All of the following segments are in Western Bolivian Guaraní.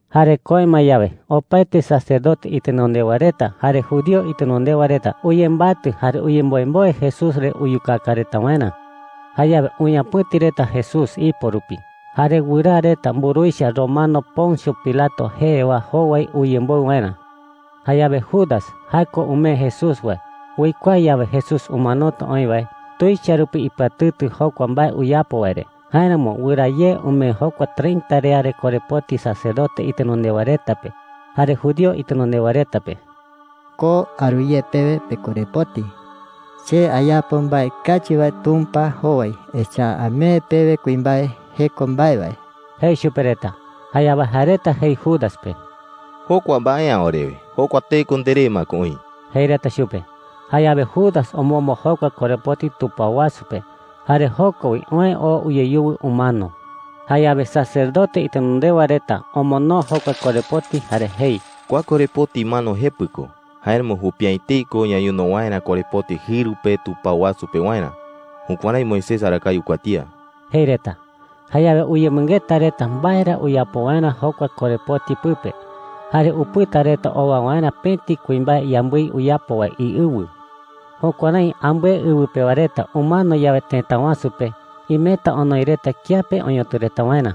Jare köe ma yawe, opaete sacerdote itenondewa reta jare judío itenondewa reta uyembatɨ jare uyemboemboe Jesús re uyukaka reta waerä. Jayawe uñapɨ̈ti reta Jesús ipo rupi, jare wɨraa reta mburuwicha romano Poncio Pilato jee wae jowai uyemboɨ waerä. Jayawe Judas – jae ko umee Jesús wae – uikuaa yawe Jesús umanota oï wae, tuicha rupi ipɨatɨtɨ jokua mbae uyapo wae re. Jáeramo wɨraa ye umee jokua treinta riare korepoti sacerdote itenondewa reta pe jare judío itenondewa reta pe. “Ko aru ye pewe pekorepoti,” jei chupe reta. “Che ayapo mbae kachi wae Tumpa jowai. Echa’ä amee pewe kuimbae jeko mbae wae,” jei chupe reta. Jayawe jae reta jei Judas pe: “Jokua mbae’ä orewe. Jokua teko nderé ma ko oï,” jei reta chupe. Jayawe Judas omombo jokua korepoti tupao wasu pe, jare joko wi oë oo uyeyuwɨ umano. Jayawe sacerdote itenondewa reta omonoo jokua korepoti jare jei: “Kua korepoti mano jepɨ ko. Jáeramo jupi’ä etei ko ñañono waerä korepoti jɨru pe tupao wasu pewarä. Jukuärái Moisés arakae uikuatía,” jei reta. Jayawe uyemɨngeta reta mbae ra uyapo waerä jokua korepoti pɨpe. Jare upɨta reta owa waerä pëti kuimbae yambɨi uyapo wae iɨwɨ. Jukuärái ambɨe ɨwɨ pewa reta umano yawe tëta wasu pe, imeta onoi reta kiape oñotɨ reta waerä.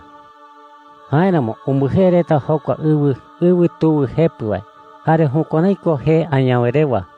Jáeramo umbɨjee reta jokua ɨwɨ: Ɨwɨ tuwɨ jepɨ wae. Jare jukuärái ko jee añawe rewa.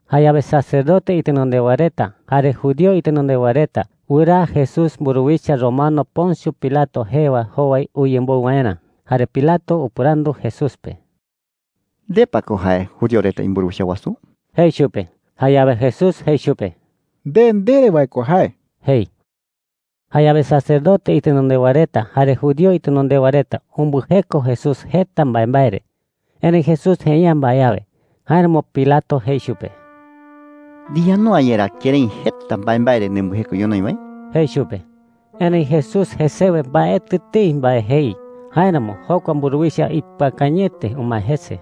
Jayawe sacerdote itenondewa reta jare judío itenondewa reta wɨraa Jesús mburuwicha romano Poncio Pilato jee wae jowai uyemboɨ waerä. Jare Pilato upɨrandu Jesús pe: “¿Nde pa ko jae judío reta imburuwicha wasu?” jei chupe. Jayawe Jesús jei chupe: “Nde ndere wae ko jae,” jei. Jayawe sacerdote itenondewa reta jare judío itenondewa reta umbɨjeko Jesús jeta mbaembae re. Erëi Jesús jei’ä mbae awe. Jáeramo Pilato jei chupe: “¿Ndiyandu’ä yerá kërái jeta mbaembae re nembɨjeko ñonoï wae?” jei chupe. Erëi Jesús jesewe mbaetɨ etei mbae jei. Jáeramo jokua mburuwicha ipɨakañɨete umae jese.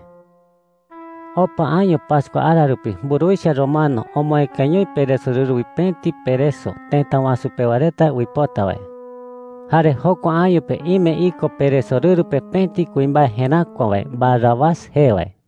Opa año pascua ara rupi mburuwicha romano omoëkañoi peresorɨru wi pëti pereso tëta wasu pewa reta uipota wae. Jare jokua año pe ime iko peresorɨru pe pëti kuimbae jeräkua wae Barrabás jee wae.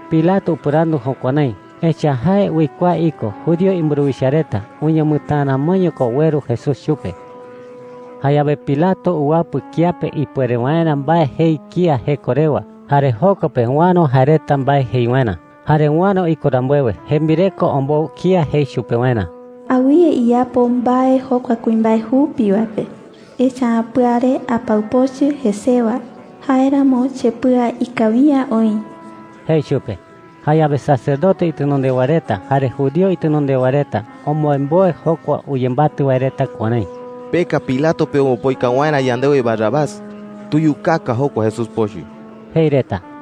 Pilato upɨrandu jukuärái, echa’ä jae uikuaa iko judío imburuwicha reta uñamɨtäa ramoño ko ueru Jesús chupe. Jayawe Pilato uwapɨ kiape ipuere waerä mbae jei kía jeko rewa. Jare joko pe uäro jae reta mbae jei waerä. Jare uäro iko rambuewe, jembireko ombou kía jei chupe waerä: “Awɨye iyapo mbae jokua kuimbae jupi wae pe. Echa’ä pɨare apau pochɨ jesewa; jáeramo chepɨa ikawi’ä oï,” jei chupe. Jayawe sacerdote itenondewa reta jare judío itenondewa reta omboemboe jokua uyembatɨ wae reta kuärái: “Peka Pilato pe ombopoika waerä yandewe Barrabás. Tuyukaka jokua Jesús pochɨ,” jei reta.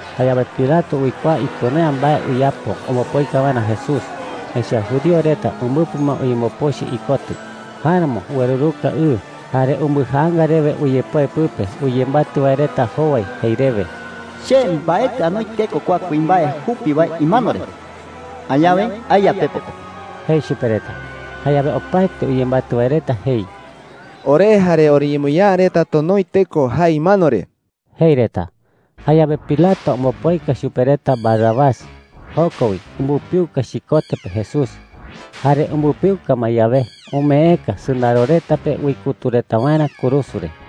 Jayawe Pilato uikuaa ipuere’ä mbae uyapo ombopoika waerä Jesús, echa’ä judío reta umbɨpɨ ma uyembopochɨ ikotɨ. Jáeramo ueruka ɨ, jare umbɨjaanga rewe uyepoe pɨpe uyembatɨ wae reta jowai jei rewe: “Che mbaetɨ anoi teko kua kuimbae jupi wae imano re. Añawe aeya pepo pe,” jei chupe reta. Jayawe opaete uyembatɨ wae reta jei: “Ore jare oriñemoñaa reta tonoi teko jae imano re,” jei reta. Jayawe Pilato ombopoika chupe reta Barrabás. Joko wi umbɨpiuka chikote pe Jesús. Jare umbɨpiuka ma yawe, umeeka sɨndaro reta pe uikutu reta waerä kurusu re.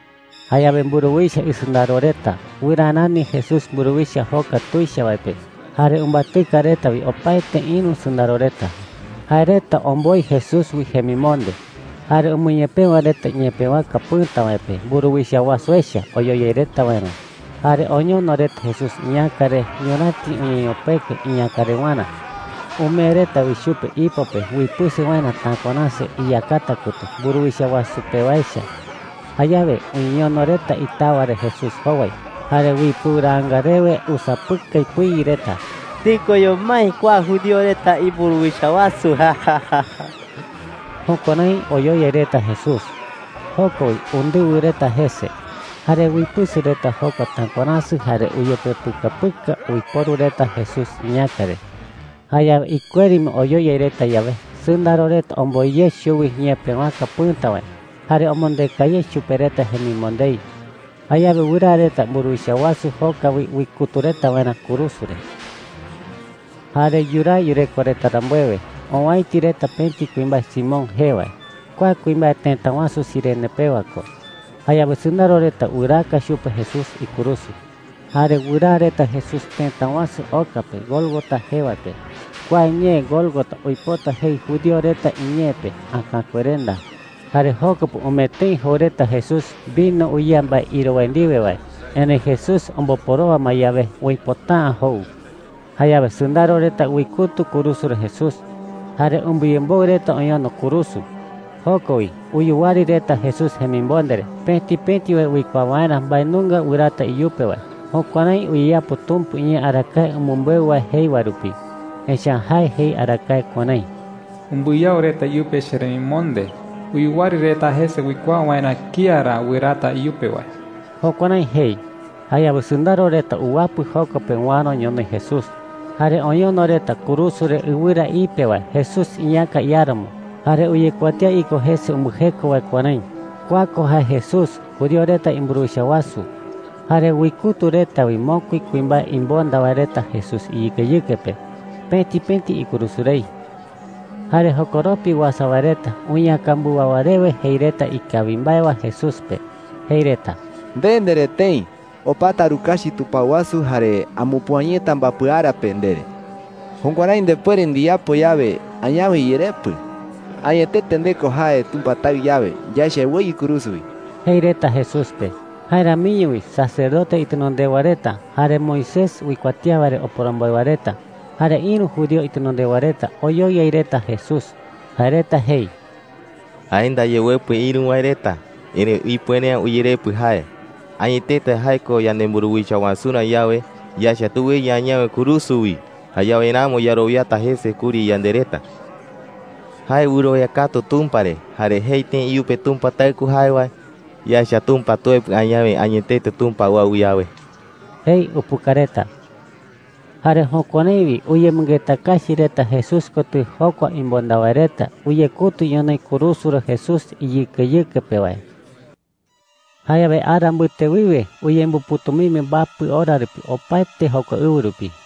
Jayawe mburuwicha isɨndaro reta wɨraa rani Jesús mburuwicha joka tuicha wae pe, jare umbatɨka reta wi opaete ïru sɨndaro reta. Jae reta omboi Jesús wi jemimonde, jare umɨñepëwa reta ñepëwaka pɨ̈ta wae pe mburuwicha wasu echa oyoyai reta waerä. Jare oñono reta Jesús iñäka re ñuräti uñeñopekue iñäkarewarä. Umee reta wi chupe ipo pe uipɨsɨ waerä takuaräsɨ iyakata kotɨ mburuwicha wasu pe wae echa. Jayawe uñeñono reta itawa re Jesús jowai, jare uipɨuraanga rewe usapɨkai pɨi reta: “¡Tikoño mái kua judío reta imburuwicha wasu!” Jukuärái oyoyai reta Jesús. Joko wi undɨwɨ reta jese. Jare uipɨsɨ reta jokua takuaräsɨ jare uyepepɨkapɨka uiporu reta Jesús iñäka re. Jayawe ikueri ma oyoyai reta yawe, sɨndaro reta omboi ye chuwi ñepëwaka pɨ̈ta wae jare omondeka ye chupe reta jemimondei. Jayawe wɨraa reta mburuwicha wasu joka wi uikutu reta waerä kurusu re. Jare yuraa yureko reta rambuewe, owäiti reta pëti kuimbae Simón jee wae. Kua kuimbae tëta wasu Cirene pewa ko. Jayawe sɨndaro reta wɨraaka chupe Jesús ikurusu. Jare wɨraa reta Jesús tëta wasu oka pe Gólgota jee wae pe. (Kua ñee Gólgota uipota jei judío reta iñee pe, “Äkakuerenda.”) Jare joko pe umee tëi jou reta Jesús vino uyea mbae iro wae ndiwe wae. Erëi Jesús omboporowa ma yawe, uipota’ä jou. Jayawe sɨndaro reta uikutu kurusu re Jesús, jare umbɨyemboɨ reta oñono kurusu. Joko wi uyuwari reta Jesús jemimonde re, pëti pëti wae uikuaa waerä mbae nunga wɨraata iyupe wae. Jukuärái uyeyapo Tumpa iñee arakae umɨmbeu wae jei wae rupi. Echa’ä jae jei arakae kuärái: “Umbɨyao reta iyupe cheremimonde. Uyuwari reta jese uikuaa waerä kía ra wɨraata iyupe wae.” Jukuärái jei. Jayawe sɨndaro reta uwapɨ joko pe uäro ñonoï Jesús. Jare oñono reta kurusu re ɨwɨra ipe wae Jesús iñäka iáramo, jare uyekuatía iko jese umbɨjeko wae kuärái: “KUA KO JAE JESÚS, JUDÍO RETA IMBURUWICHA WASU.” Jare uikutu reta wi mokui kuimbae imonda wae reta Jesús iyɨkeyɨke pe, pëti pëti ikurusu rei. Jare jokoropi uasa wae reta uñeäkambɨwawa rewe jei reta ikawi mbae wae Jesús pe. Jei reta: “Nde ndere tëi: ‘Opata arukachi tupao wasu jare amupüa yeta mbapɨ ara pe,’ ndere. Jukuärái ndepuere ndiyapo yawe, añawe iyerepɨ. Añetete nde ko jae Tumpa Taɨ yawe, yaecha eweyɨ kurusu wi,” jei reta Jesús pe. Jae ramiño wi sacerdote itenondewa reta, jare Moisés uikuatía wae re oporomboe wae reta, jare ïru judío itenondewa reta oyoyai reta Jesús. Jae reta jei: “Jae ndaye uepɨ ïru wae reta, erëi ipuere’ä uyerepɨ jae. Añetete jae ko yanemburuwicha wasurä yawe, yaecha tuweyɨ añawe kurusu wi. Jayawe ramo yarowiata jese kuri yande reta,” jei reta. “Jae wɨrowia katu Tumpa re, jare jei tëi iyupe Tumpa Taɨ ko jae wae. Yaecha Tumpa tuepɨ añawe, añetete Tumpa uau yawe,” jei upuka reta. Jare jukuärái wi uyemɨngeta kachi reta Jesús kotɨ jokua imonda wae reta uyekutu ñonoï kurusu re Jesús iyɨkeyɨke pe wae. Jayawe ara mbɨte wiwe uñemɨpɨ̈tumimbi mbapɨ ora rupi opaete jokua ɨwɨ rupi.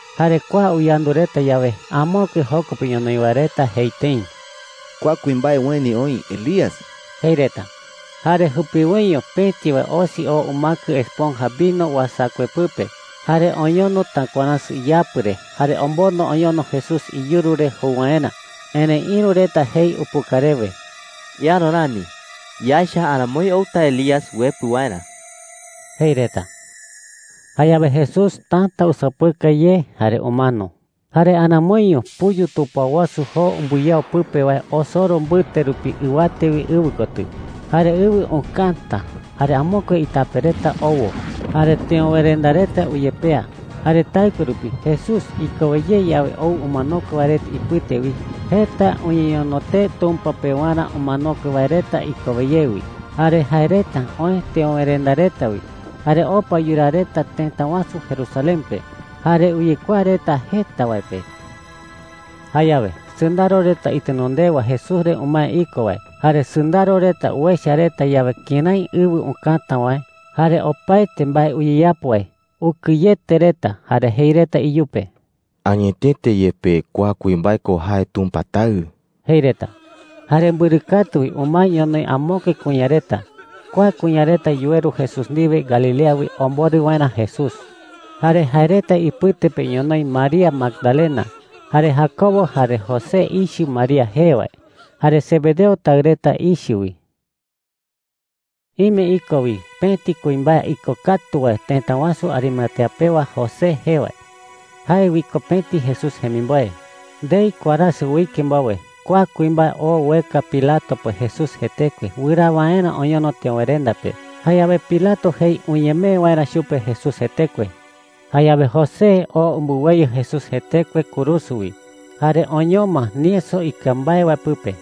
Jare kua uyandu reta yawe, amokue joko pe ñonoï wae reta jei tëi: “Kua kuimbae ueni oï Elías,” jei reta. Jare jupiwoiño pëti wae osi oo umäkɨ esponja vino uasakue pɨpe, jare oñono takuaräsɨ iyapɨ re, jare omondo oñono Jesús iyuru re jou waerä. Erëi ïru reta jei upuka rewe: “Eäro rani. Yaecha aramoi outa Elías uepɨ waerä,” jei reta. Jayawe Jesús täta usapɨkai ye jare umano. Jare aramoiño puyu tupao wasu joo umbɨyao pɨpe wae osoro mbɨte rupi ɨwate wi ɨwɨ kotɨ. Jare ɨwɨ ukäta, jare amokue itape reta owo. Jare teöwerenda reta uyepea. Jare taɨkue rupi, Jesús ikowe ye yawe ou umanokue wae reta ipɨte wi, jeta uñeñono tee Tumpa pewarä umanokue wae reta ikowe ye wi. Jare jae reta oë teöwerenda reta wi, jare opa yuraa reta tëta wasu Jerusalén pe, jare uyekuaa reta jeta wae pe. Jayawe sɨndaro reta itenondewa Jesús re umae iko wae jare sɨndaro reta uecha reta yawe kërái ɨwɨ ukäta wae jare opaete mbae uyeyapo wae, ukɨyete reta, jare jei reta iyupe: “Añetete yepe, kua kuimbae ko jae Tumpa Taɨ,” jei reta. Jare mbɨrɨ katu wi umae ñonoï amokue kuña reta. Kua kuña reta yuweru Jesús ndiwe Galilea wi omborɨ waerä Jesús. Jare jae reta ipɨte pe ñonoï María Magdalena, jare Jacobo jare José ichɨ María jee wae, jare Zebedeo taɨ reta ichɨ wi. Ime iko wi pëti kuimbae ikokatu wae tëta wasu Arimatea pewa José jee wae. Jae wi ko pëti Jesús jemimboe. Ndei warasɨ uike mbowe, kua kuimbae oo ueka Pilato pe Jesús jetekue wɨraa waerä oñono teöwerenda pe. Jayawe Pilato jei uñemee waerä chupe Jesús jetekue. Jayawe José oo umbɨweyɨ Jesús jetekue kurusu wi, jare oñoma nieso ikɨa mbae wae pɨpe.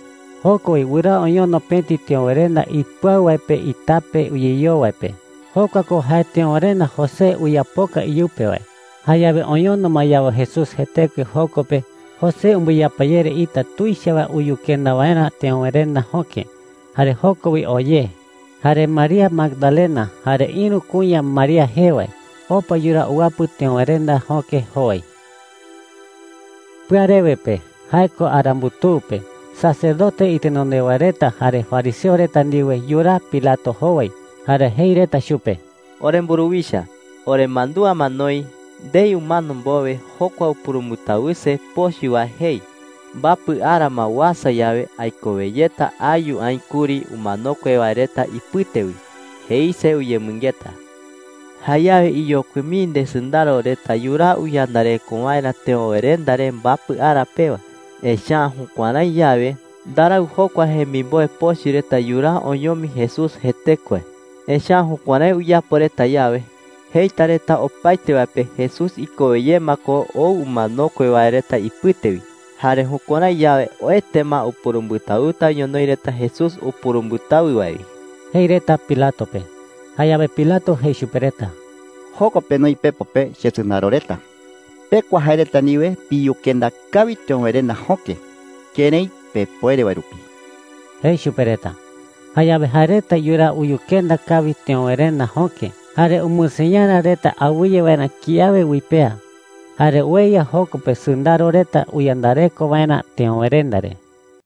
Joko wi wɨraa oñono pëti teöwerenda ipɨau wae pe itape uyeyoo wae pe. Jokua ko jae teöwerenda José uyapoka iyupe wae. Jayawe oñono ma yawe Jesús jetekue joko pe, José umbɨyapayere ita tuicha wae uyukenda waerä teöwerenda jöke. Jare joko wi oo ye. Jare María Magdalena jare ïru kuña María jee wae opa yuraa uwapɨ teöwerenda jöke jowai. Pɨarewe pe – jae ko ara mbutuu pe – sacerdote itenondewa reta jare fariseo reta ndiwe yuraa Pilato jowai. Jare jei reta chupe: “Oremburuwicha, oremandúa ma noï, ndei umano mbowe jokua upurumbɨtawɨse pochɨ wae jei, ‘Mbapɨ ara ma uasa yawe, aikowe yeta ayu aï kuri umanokue wae reta ipɨte wi,’ jeise uyemɨngeta. Jayawe iyokui mii ndesɨndaro reta yuraa uyandareko waerä teöwerenda re mbapɨ ara pewa. Echa’ä jukuärái yawe, ndarau jokua jemimboe pochɨ reta yuraa oñomi Jesús jetekue. Echa’ä jukuärái uyapo reta yawe, jeita reta opaete wae pe Jesús ikowe ye ma ko ou umanokue wae reta ipɨte wi. Jare jukuärái yawe, oete ma upurumbɨtawɨta ñonoï reta Jesús upurumbɨtawɨ wae wi,” jei reta Pilato pe. Jayawe Pilato jei chupe reta: “Joko penoi pepo pe chesɨndaro reta. Pekua jae reta ndiwe piyukenda kawi teöwerenda jöke kërái pepuere wae rupi,” jei chupe reta. Jayawe jae reta yuraa uyukenda kawi teöwerenda jöke. Jare umɨseñara reta awɨye waerä kiawe uipea. Jare ueya joko pe sɨndaro reta uyandareko waerä teöwerenda re.